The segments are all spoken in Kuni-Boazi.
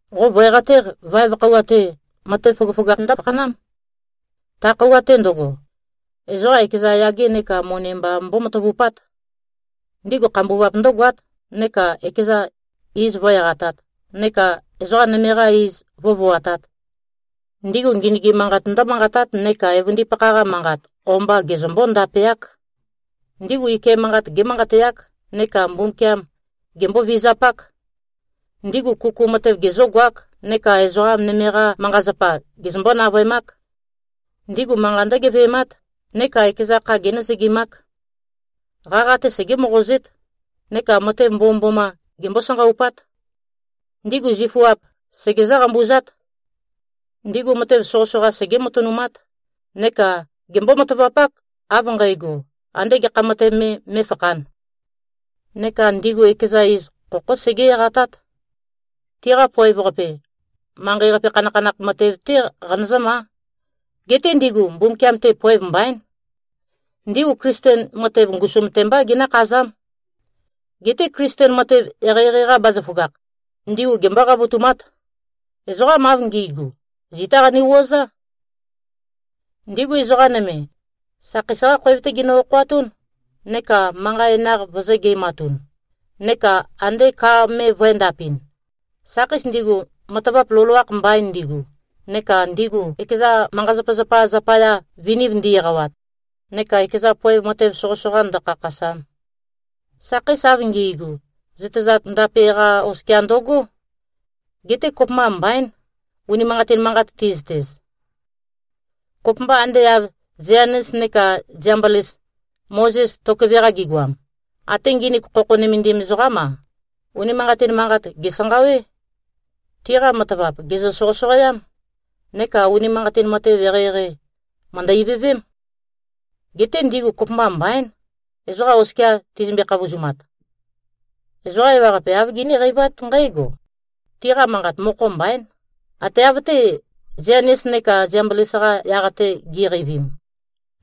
Qo vø̀e-qatéq, vaev khøuwa-te, matev føgøføgakh ndǿfakhanám. Ta khøuwa-te ndøgo, ezoqa ekeza yage neka moni mba mbómatavupát. Ndigu khambuvap ndǿgoát neka ekeza iz vǿ-eqatāt, neka ezoqa nøme-qa iz vǿvoatāt. Ndigu ngenøgim manqat ndǿmanqatát neka evøndipakha-qa manqa o-mba gezømbó-ndapeák. Ndigu ike manqat gémanqateák neka Mbumbukiam gembó-vizapák. Ndigu kuku matev gezǿgoák, neka ezoqa nøme-qa manqa-zapa gezømbó-navøemák. Ndigu manqa ndǿgeve꞉mát, neka ekeza kha génøzøgimák. Qaqa-te segé-moqozét, neka matev mbomømboma gembó-sanqaupát. Ndigu zifuap segezǿ-qambuzát. Ndigu matev soqøsoqa segé-matønumát neka gembó-matavapák, av nqægo, andé gekha matev me mé꞉fakhān. Neka ndigu ekeza iz khokhó segé-eqatát. Tiqa poev-qape, manqei-qape khanakhanakh matev-té qanøzǿmá. Geté ndigu Mbumbukiam-te poev mbaín. Ndigu Klisten matev, ngusum-te mbá ginǿkhazám. Geté Klisten matev eqeieqei-qa bazaføgakh, ndigu gembó-qavotumát. Ezoqam av ngi꞉gu, zitá qane-wuøezá. Ndigu ezoqa nøme, sakheis-qá khoev-té ginø-okhoatún, neka manqa enøenaq vøzø̄-ge꞉matun, neka ande ka me vø̄endapɨn, sakheis ndigu matavap loloakh mbain ndigu, neka ndigu ekeza manqa-zapazapa zapaya, viniv ndi-eqawat, neka ekeza poev matev soqøsoqa ndø̄khākhāsām. Sakheis av ngi꞉gu, zøtezat ndape-qa oskia ndøgó. Geté kopømba mbaín, unimanqatin manqat ti꞉zøtez. Kopømba ande av Zianes neka Ziambles, Mozes tokøve-qa gigoam, até nginik khokho nømendim ezoqám-a, unimanqatin manqat, gèsanqawé. Tiqa matavap, gèzø-soqøsoqoám. Neka unimanqatin matev eqeieqei, mø̀ndø-ivøvém. Geté ndigu kopømba mbaín, ezoqa oskia tizømbe-khavozumat. Ezoqa ewaqape, āv giníqeivát nqǽgo: Tiqa manqat mokho mbaín, ate av-té, Zianes neka Ziambles-qa yaq-te gi꞉qeivim,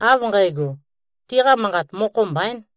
av nqægo, tiqa manqat mokho mbaīn.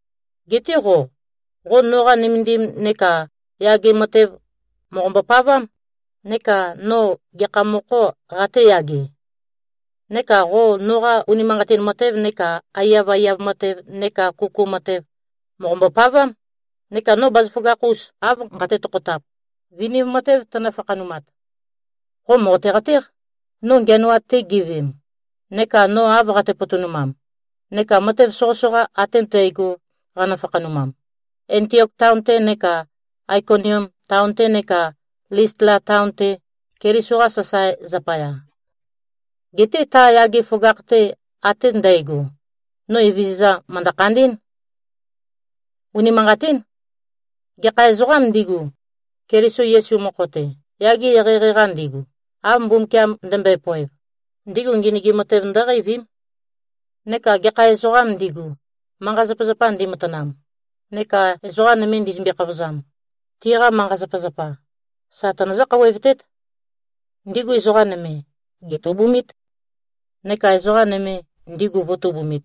Geté qo, qo noqa nømendim neka yage matev mòqombo-pavám, neka no gekha mokho qatēyage. Neka qo noqa unimanqatin matev neka aiyaiyav matev neka kuku matev, mòqombo-pavám, neka no bazaføgakh-us av nqate-tokhotap, viniv matev tønø-fakhanumat. Qo mòqote-qatéq, no ngiænoat-te giveem, neka no av qate-potonumam, neka matev soqøsoqa ate ndægo qanø-fakhanumam, Antiok taon-te neka Aikonium taon-te neka Listla taon-te, Keliso-qa sasae zapaya. Geté ta yage føgakh-te ate ndægo, no Evezøza, mø̀ndø-khandí꞉n. Unimanqatín. Gekha ezoqām ndigu, Keliso Yesu mokho-te, yage eqeieqei-qa ndigu, av Mbumbukiam ndømbøe-poev, ndigu ngenøgim matev ndǿqeivím. Neka gekha ezoqām ndigu, manqa-zapazapa ndimatanam neka ezoqa nøme ndizømbe-khavozam, tiqa manqa-zapazapa, sa tønøzǿ-khouwevtét. Ndigu ezoqa nøme, gètubumít, neka ezoqa nøme, ndigu vø̄tubumit.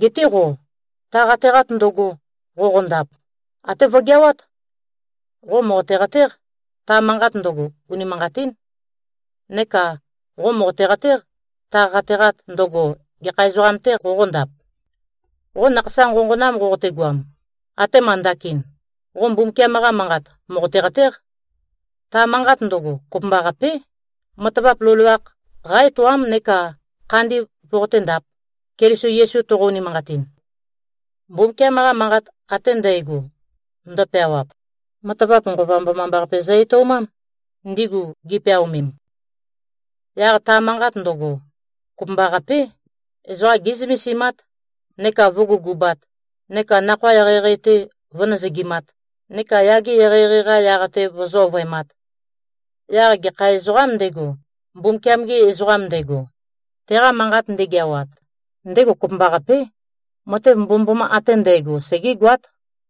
Geté qo, ta qateqat ndøgo, qoqondap, até vøgeawát. Qo mòqote-qatéq, ta manqat ndøgo, unimanqatín. Neka qo mòqote-qatéq, ta qateqat ndøgo, gekha ezoqam-tē qoqondap. Qo nakhasa nqonqonam qoqotegoam, atema ndakin, qo Mbumbukiam-qa Manqat mòqote-qatéq. Ta manqat ndøgo, kopømbaqapé, matavap loloakh qá-etoám neka khandi voqoténdāp, Keliso Yesu toqo-unimanqatin. Mbumbukiam-qa Manqat ate ndægo, ndøpeawap, matavap Nqova Mbomambaqape zø-etoumám, ndigu gipeaomem. Yaq ta manqat ndøgo, kopømbaqapé, ezoqa gé꞉zømesimát, neka vǿgugubāt, neka nakhoa eqeieqei-te vøzǿ-nøzøgimāt, neka yage eqeieqei-qa yaq-te vøzǿ-ovøemāt. Yaq gekha ezoqām ndego, Mbumbukiam-ge ezoqam ndego, teqa manqat ndegeawat, ndego kopømbaqapé, matev mbomømboma ate ndægo segégoát.